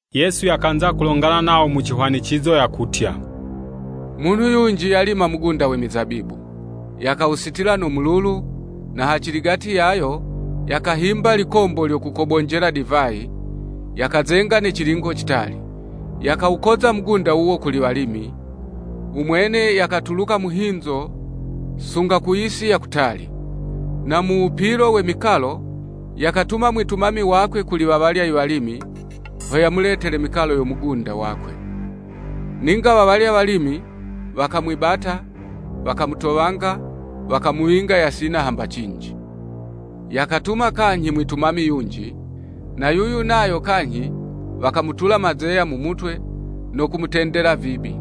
Yesu yakanza kulongana nawo mu cihwanicizo yakutya, “Munhu yunji yalima mugunda we mizabibu. Yakawusitila no mululu, na haciligati yayo, yakahimba likombo lyo kukobonjela divayi, yakazenga ne cilingo citali. Yakawukoza mugunda wuwo kuli walimi, u mwene yakatuluka muhinzo sunga ku yisi ya kutali. Na mu wupilo we mikalo, yakatuma mwitumami wakwe kuli wawalya iwalimi, ho yamuletele mikalo yo mugunda wakwe. Ninga wawalya walimi wakamwibata, wakamutowanga, wakamuwinga yasina hamba cinji. Yakatuma kanyhi mwitumami yunji, na yuyu nayo kanyhi, wakamutula mazeya mu mutwe, no kumutendela vibi.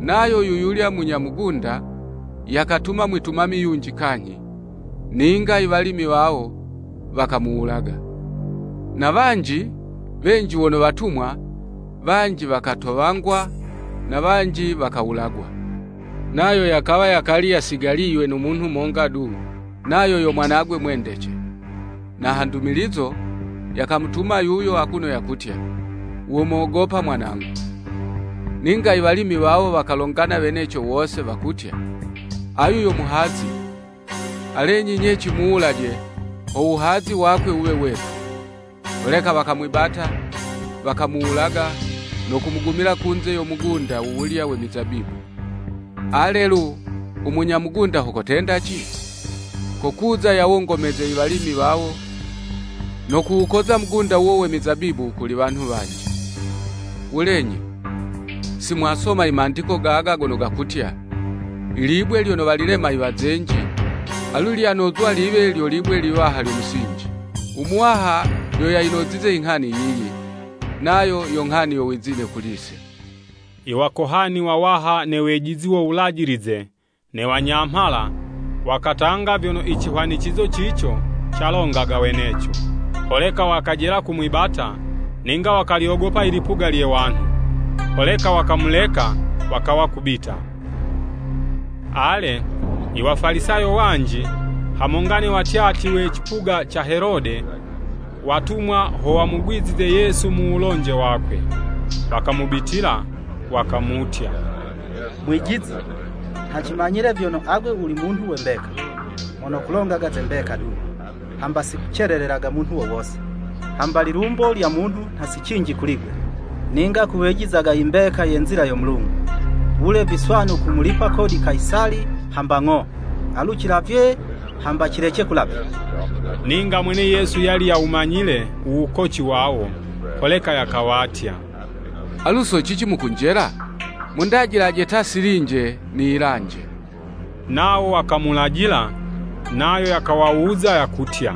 Nayo yuyulya munya mugunda, yakatuma mwitumami yunji kanyhi, ninga iwalimi wawo wakamuwulaga. Na wanji, wenji wono watumwa, wanji wakatowangwa, na wanji wakawulagwa. Nayo yakawa yakali yasigaliywe no munhu monga du, nayo yo mwanagwe mwendece. Na handumilizo, yakamutuma yuyo akuno yakutya, ‘Womogopa mwanangu.’ Ninga iwalimi wawo wakalongana weneco wose, wakutya, ‘Ayu yo muhazi, alenyi nye cimuwulaje, ho wuhazi wakwe wuwe wetu!’ Holeka wakamwibata, wakamuwulaga, no kumugumila kunze yo mugunda wuwulya we mizabibu. “Ale lu, u munya mugunda ho kotendaci? Kokuza yawongomeze i walimi wawo, no kuwukoza mugunda wuwo we mizabibu kuli wanhu wanji. Wulenyi, si mwasoma i Mandiko gaga gono gakutya, ‘Ilibwe lyono walilema iwazenji alu lyanozwa liwe lyo libwe liwaha lyo musinji, U Muwaha yoyayinozize inghani yiyi, nayo yo nghani yo wizine kuli'se.'" Iwakohani wawaha ne Wejizi wo Wulajilize ne wanyamhala, wakatanga vyono i cihwanicizo cico calongaga weneco. Holeka wakajela kumwibata, ninga wakalyogopa i lipuga lye wanhu. Holeka wakamuleka wakawa kubita. Ale, Iwafalisayo wanji, hamonga ne watyatyi we cipuga ca Helode, watumwa ho wamugwizize Yesu mu wulonje wakwe. Wakamubitila, wakamutya, “Mwijizi, nha cimanyile vyono agwe uli munhu we mbeka, mono kulongaga ze mbeka du, hamba sikucelelelaga munhu wo wose. Hamba lilumbo lya munhu, nha si cinji kuli'gwe, ninga kuwejizaga imbeka ye nzila yo Mulungu. Wule, viswanu kumulipa kodi Kayisali, hamba ng'o? Alu cilavye, hamba cilece kulavya?” Ninga mwene Yesu yali yawumanyile u wukoci wawo, holeka yakawatya, “Alu so cici mukunjela? Mundajilaje ta silinje niyilanje.” Nawo wakamulajila. Nayo yakawawuza, yakutya,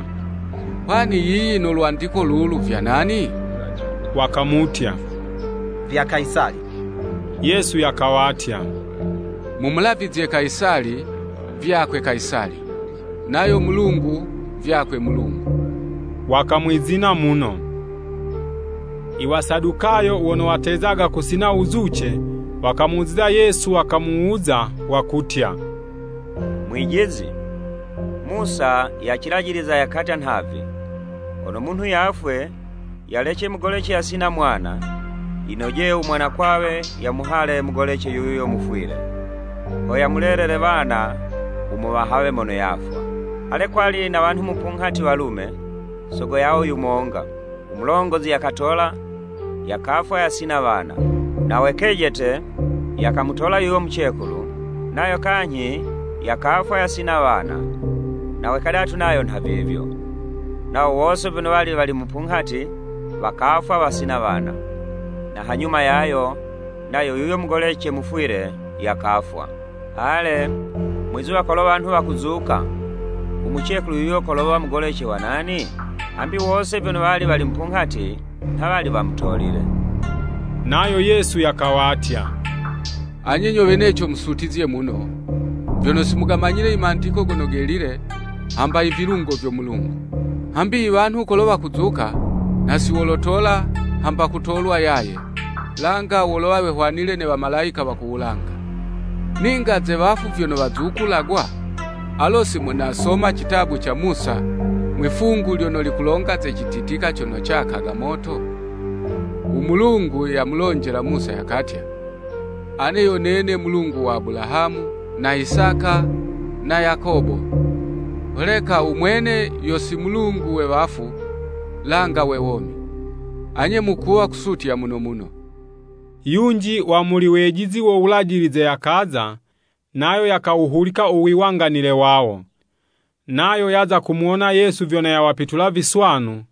“Hwani yiyi no lwandiko lulu vya nani?” Wakamutya, “Vya Kayisali.” Yesu yakawatya, “Mumulavizye Kayisali vyakwe Kayisali, nayo Mulungu vyakwe Mulungu.” Wakamwizina muno. Iwasadukayo wono watezaga kusina wuzuce, wakamuziza Yesu wakamuwuza, wakutya, “Mwijizi, Musa yacilajiliza yakatya nhavi: ‘Hono munhu yafwe, yalece mugolece yasina mwana, yinojeye umwanakwawe yamuhale mugolece yuyo mufwile, ho yamulelele wana umuwahawe mono yafwa.’ Ale, kwali na wanhu mupunghati walume, sogo yawo yumonga. Umulongozi yakatola, yakafwa yasina wana. Na we kejete yakamutola yuyo mucekulu, nayo kanyhi yakafwa yasina wana, na we kadatu nayo nha vivyo. Nawo wose vyono wali wali mupunghati, wakafwa wasina wana. Na hanyuma yayo, nayo yuyo umugolece mufwile yakafwa. Ale, mwi'zuwa kolo wanhu wakuzuka, u mucekulu yuyo kolowa mugolece wa nani? Hambi wose vyono wali wali mupunghati nha wali wamutolile.” Nayo Yesu yakawatya, “Anye nyo weneco musutizye muno, vyono si mugamanyile i Mandiko Gono Gelile hamba ivilungo vyo Mulungu. Hambi iwanhu kolo wakuzuka, nha siwolotola hamba kutolwa yaye, langa wolowa wehwanile ne wamalayika wa ku wulanga. Ninga ze wafu vyono wazukulagwa, Alo simunasoma citabu ca Musa mwifungu lyono likulonga ze cititika cono cakaga moto? U Mulungu yamulonjela Musa yakatya, ‘Ane yonene Mulungu wa Abulahamu, na Isaka na Yakobo.’ Holeka u mwene yo si Mulungu we wafu langa we womi. Anye mukuwa kusutya muno muno.” Yunji wa muli wejizi wo Wulajilize yakaza, nayo yakawuhulika u wiwanganile wawo. Nayo yaza kumuwona Yesu vyono yawapitula viswanu,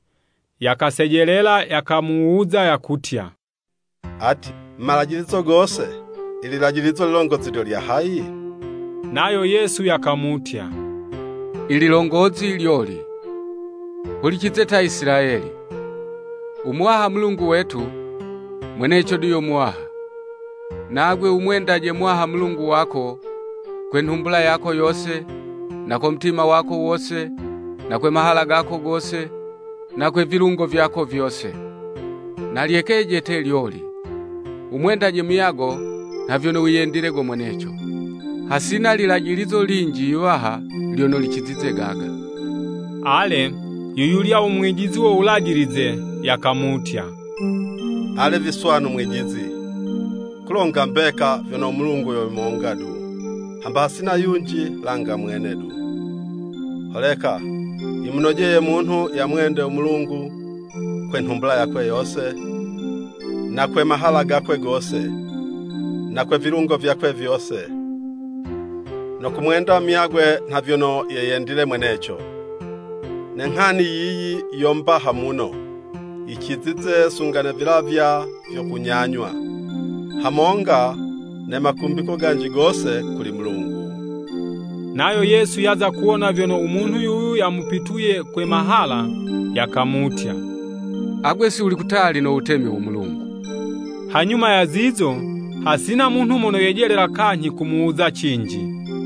yakasejelela yakamuwuza yakutya, Ati, mu malajilizo gose, i lilajilizo lilongozi lyo lya hayi? Nayo Yesu yakamutya, “Ililongozi lyoli, ‘Hulicize ta Isilayeli! U Muwaha Mulungu wetu, mweneco du yo Muwaha. Nagwe wumwendaje Muwaha Mulungu wako kwe nhumbula yako yose, na ko mutima wako wose, na kwe mahala gako gose, na kwe vilungo vyako vyose.’ Na lye kejete lyo'li, ‘Wumwendaje muyago nha vyono wiyendile go mweneco. Hasina lilajilizo linji yiwaha lyono licizize gaga.'" Ale, yuyulya umwijizi wo Wulajilize yakamutya, “Ale viswanu Mwijizi! Kulonga mbeka vyono u Mulungu yumonga du, hamba hasina yunji langa mwene du. Holeka yimunojeye munhu yamwende u Mulungu kwe nhumbula yakwe yose, na kwe mahala gakwe gose, na kwe vilungo vyakwe vyose, no kumwenda muyagwe nha vyono yeyendile mweneco. Ne Nghani yiyi yo mbaha muno yicizize sunga ne vilavywa vyo kunyanywa hamonga ne makumbiko ganji gose kuli Mulungu.” Nayo Yesu yaza kuwona vyono umunhu yuyu yamupituye kwe mahala, yakamutya, “Agwe si wuli kutali no wutemi wo Mulungu.” Hanyuma ya zizo hasina munhu mono yejelela kanyhi kumuwuza cinji.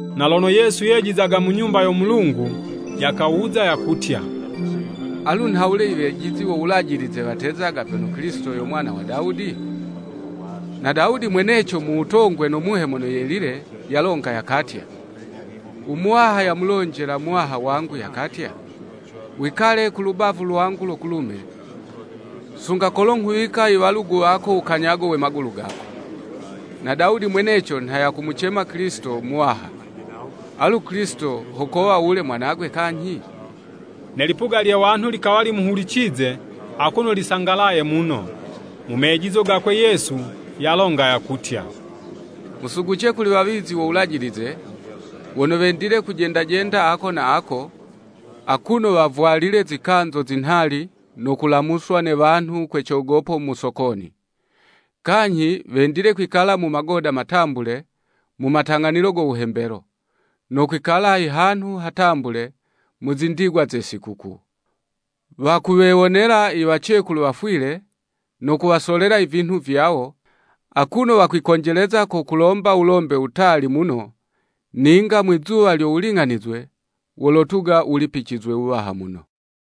Na lono Yesu yejizaga mu Nyumba yo Mulungu, yakawuza yakutya, “Alu nhawule iwejizi wo Wulajilize watezaga vyono Kilisito yo mwana wa Dawudi? Na Dawudi mweneco mu wutongwe no Muhe Mono Yelile yalonga yakatya, ‘U Muwaha yamulonjela Muwaha wangu yakatya, Wikale ku lubavu lwangu lo kulume, sunga kolo nghuwika iwalugu wako wukanyago we magulu gako.’ “Na Dawudi mweneco nha yakumucema Kilisito, Muwaha. Alu Kilisito ho kowa wule mwanagwe kanyhi?” Ne lipuga lye wanhu likawa limuhulicize akuno lisangalaye muno. Mu mejizo gakwe Yesu yalonga yakutya, “Musuguce kuli wejizi wo Wulajilize, wono wendile kujenda jenda ako, na ako akuno wavwalile zikanzo zinhali no kulamuswa ne wanhu kwe cogopo mu Sokoni, kanyhi wendile kwikala mu magoda matambule mu matang'anilo go wuhembelo, no kwikala i hanhu hatambule mu zindigwa ze zisikukuu. Wakuwewonela i wacekulu wafwile, no kuwasolela i vinhu vyawo, akuno wakwikonjeleza ko kulomba wulombe wutali muno! Ninga mwizuwa lyo wuling'anizwe, wolotuga wulipicizwe wuwaha muno.”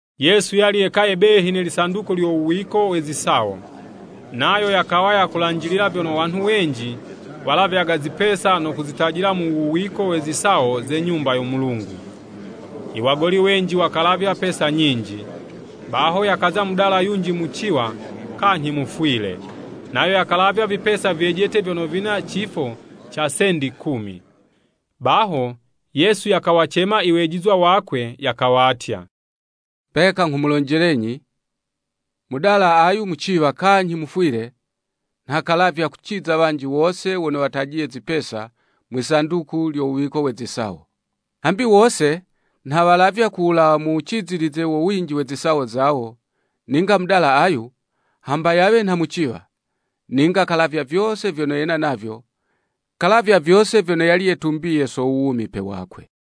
Yesu yali yekaye behi ne lisanduku lyo wuwiko we zisawo. Nayo yakawa yakulanjilila vyono wanhu wenji walavyaga zipesa no kuzitajila mu wuwiko we zisawo ze Nyumba yo Mulungu. Iwagoli wenji wakalavya pesa nyinji. Baho yakaza mudala yunji muciwa kanyhi mufwile, nayo yakalavya vipesa vyejete vyono vina cifo ca sendi 'kumi. Baho Yesu yakawacema iwejizwa wakwe yakawatya, “Mbeka nghumulonjelenyi, mudala ayu muciwa kanyhi mufwile, nha kalavya kuciza wanji wose wono watajiye zipesa mwi'sanduku lyo wuwiko we zisawo. Hambi wose nha walavya ku wulawa mu wucizilize wo winji we zisawo zawo, ninga mudala ayu, hamba yawe nha muciwa, ninga kalavya vyose vyono yena navyo, kalavya vyose vyono yali yetumbiye so wuwumipe wakwe.”